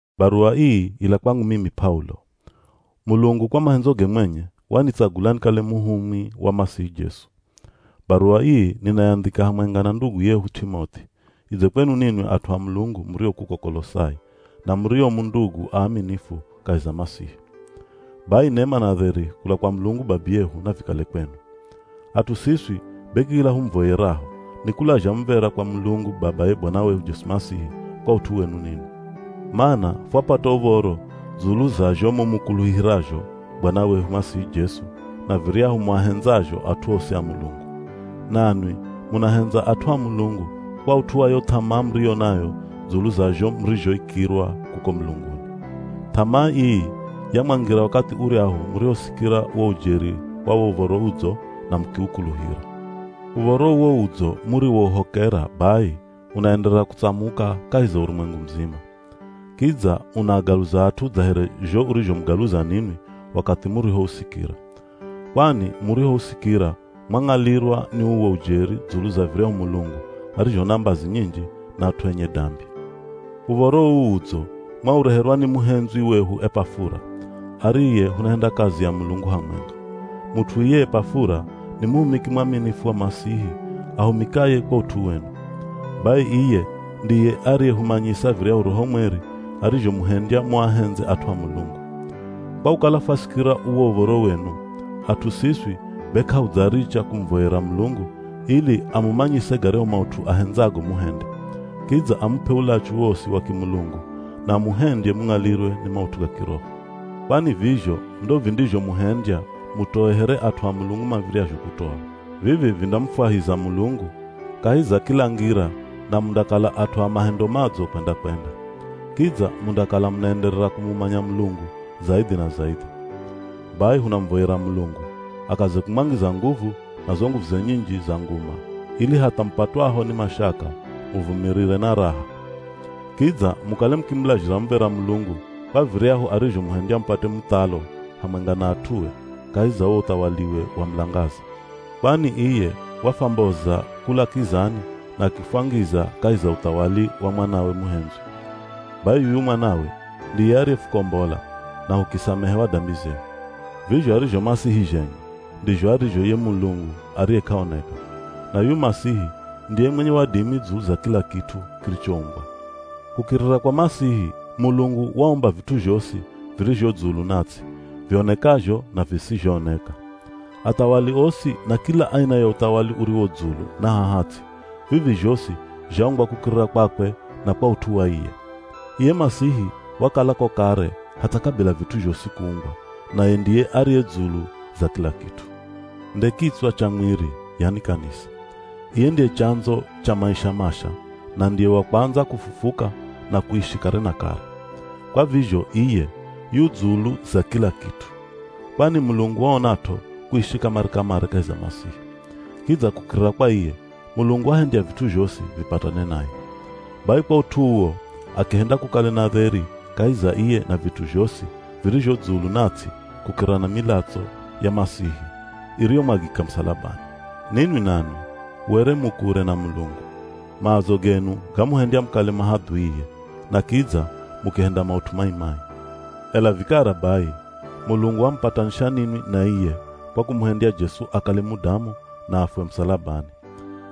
Baruwa ii ila kwangu mimi P'aulo. Mulungu kwa mahendzoge mwenye, wanitsagula nikale muhumwi wa Masihi Jesu. Baruwa ii ninayandhika hamwenga na ndugu yehu T'imoth'i, idze kwenu ninwi at'u a Mulungu murio kuko Kolosai, na murio mu ndugu aaminifu kahi za Masihi. Bai nema na dheri kula kwa Mulungu Babiyehu navikale kwenu. At'u siswi be kila humuvoyeraho, nikulazha muv̱era kwa Mulungu babaye Bwana wehu Jesu Masihi kwa ut'u wenu ninwi. Mana fwapata uv̱oro dzulu za zho mumukuluhirazho Bwana wehu Masihi Jesu na viryahu muahendzazho at'u osi a Mulungu. Nanwi munahendza at'u a Mulungu kwa ut'u wa yo th'amaa muriyo nayo dzulu za zho murizhoikirwa kuko mulunguni. Th'amaa ii yamwangira wakathi uryahu murihosikira wo ujeri wa wo Uv̱oro Udzo na mukiukuluhira. Uv̱oro uwo Udzo muriwouhokera bai unaenderera kutsamuka kahi za urumwengu muzima. Kidza unaagaluza at'u dza here zho urizhomugaluza ninwi wakathi murihousikira. Kwani murihousikira mwang'alirwa ni uwo ujeri dzulu za viryahu Mulungu arizho na mbazi nyinji na at'u enye dambi. Uv̱oro uu Udzo mwaureherwa ni muhendzwi wehu Epafura, ariye hunahenda kazi ya Mulungu hamwenga. Mut'u iye Epafura ni muhumiki mwaminifu wa Masihi ahumikaye kwa ut'u wenu. Bai iye ndiye ariyehumanyisa viryahu Roho Mweri arizhomuhendya muahendze at'u a Mulungu. Kwa kukala fwasikira uwo uv̱oro wenu, at'u siswi be k'ahudzaricha kumuvoyera Mulungu ili amumanyise garyahu maut'u ahendzago muhende. Kidza amup'e ulachu wosi wa kimulungu na amuhendye mung'alirwe ni maut'u ga kiroho. Kwani vizho ndo vindizhomuhendya mutoe here at'u a Mulungu mav̱iryazho kutoa. Vivi vindamufwahiza Mulungu kahi za kila ngira na mundakala at'u a mahendo madzo kwenda-kwenda. Kidza mundakala munaenderera kumumanya Mulungu zaidhi na zaidhi. Bai hunamuvoyera Mulungu akaze kumwangiza nguvu na zo nguvuze nyinji za nguma ili hatha mupatwaho ni mashaka, muvumirire na raha. Kidza mukale mukimulazhira muv̱era Mulungu kwa viryahu arizhomuhendya mupate muthalo hamwenga na at'ue kahi za wo uthawaliwe wa mulangaza. Kwani iye wafwamboza kula kizani na akifwangiza kahi za uthawali wa Mwanawe muhendzwi. Bai yuyu Mwanawe ndiye ariyefukombola, na hukisamehewa dambi zehu. Vizho arizho Masihi zhenye, ndizho arizho ye Mulungu ariye k'aoneka. Na yuyu Masihi ndiye mwenye wadimi dzulu za kila kit'u kirichoumbwa. Kukirira kwa Masihi, Mulungu waumba vit'u zhosi virizho dzulu na ts'i, vionekazho na visizhooneka. Athawali osi na kila aina ya uthawali uriwo dzulu na haha ts'i, vivi zhosi zhaumbwa kukirira kwakwe na kwa ut'u wa iye. Iye Masihi wakalako kare hatha kabila vit'u zhosi kuumbwa, naye ndiye ariye dzulu za kila kit'u. Nde kitswa cha mwiri, yani kanisa. Iye ndiye chandzo cha maisha masha na ndiye wa kwandza kufufuka na kuishi kare na kare. Kwa vizho iye yu dzulu za kila kit'u. Kwani Mulungu waonat'o kuishi kamare-kamare kahi za Masihi. Kidza kukirira kwa iye, Mulungu wahendya vit'u zhosi, vipatane naye. Bai kwa ut'u uwo akihenda kukale na dheri kahi za iye na vit'u zhosi virizho dzulu na ts'i kukirira na milatso ya Masihi iriyomwagika musalabani. Ninwi nanwi, were mu kure na Mulungu. Maazo genu gamuhendya mukale mahadhuie, na kidza mukihenda maut'u mai-mai. Ela vikara bai, Mulungu wamupatanisha ninwi na iye kwa kumuhendya Jesu akale mudamu na afwe musalabani.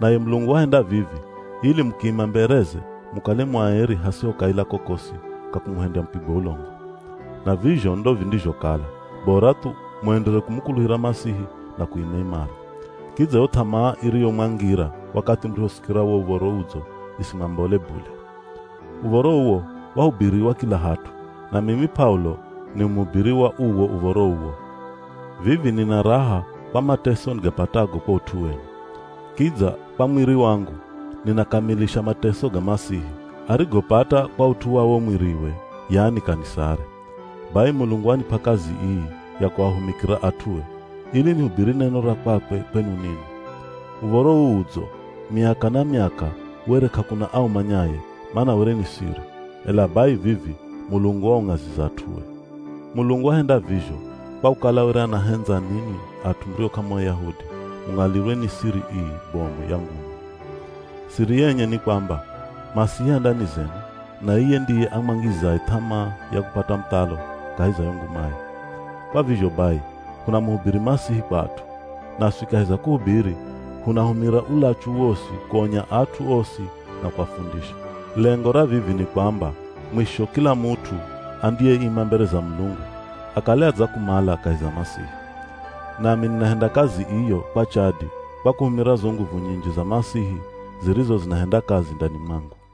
Naye Mulungu wahenda vivi ili mukiima mbereze mukale mu aeri hasiho kaila kokosi ka kumuhendya mupigwe ulongo. Na vizho ndo vindizhokala, bora thu muenderere kumukuluhira Masihi na kuima imara. Kidza yo th'amaa iriyomwangira wakathi murihosikira wo Uv̱oro Udzo isimwambole bule. Uv̱oro uwo wahubiriwa kila hat'u, na mimi P'aulo ni muhubiri wa uwo uv̱oro uwo. Vivi nina raha kwa mateso nigapatago kwa ut'u wenu. Kidza kwa mwiri wangu, ninakamilisha mateso ga Masihi, arigopata kwa ut'u wa wo mwiriwe, yani kanisare. Bai Mulungu wanip'a kazi ii ya kuahumikira at'ue, ili nihubiri neno ra kwakwe kwenu ninwi. Uv̱oro uu Udzo, miaka na miaka were k'akuna aumanyaye, mana were ni siri, ela bai vivi Mulungu waung'aziza at'ue. Mulungu wahenda vizho, kwa kukala were anahendza ninwi at'u murio k'amu Ayahudi mung'alirwe ni siri ii bomu ya nguma. Siri yenye ni kwamba, Masihi a ndani zenu, na iye ndiye amwangizaye th'amaa ya kupata muthalo kahi za yo ngumaye. Kwa vizho bai hunamuhubiri Masihi kwa at'u. Naswi kahi za kuhubiri hunahumira ulachu wosi kuonya at'u osi na kuafundisha. Lengo ra vivi ni kwamba mwisho kila mut'u andiyeima mbere za Mulungu, akale adzakumala kahi za Masihi. Nami ninahenda kazi iyo kwa chadi kwa kuhumira zo nguvu nyinji za Masihi zirizo zinahenda kazi ndani mwangu.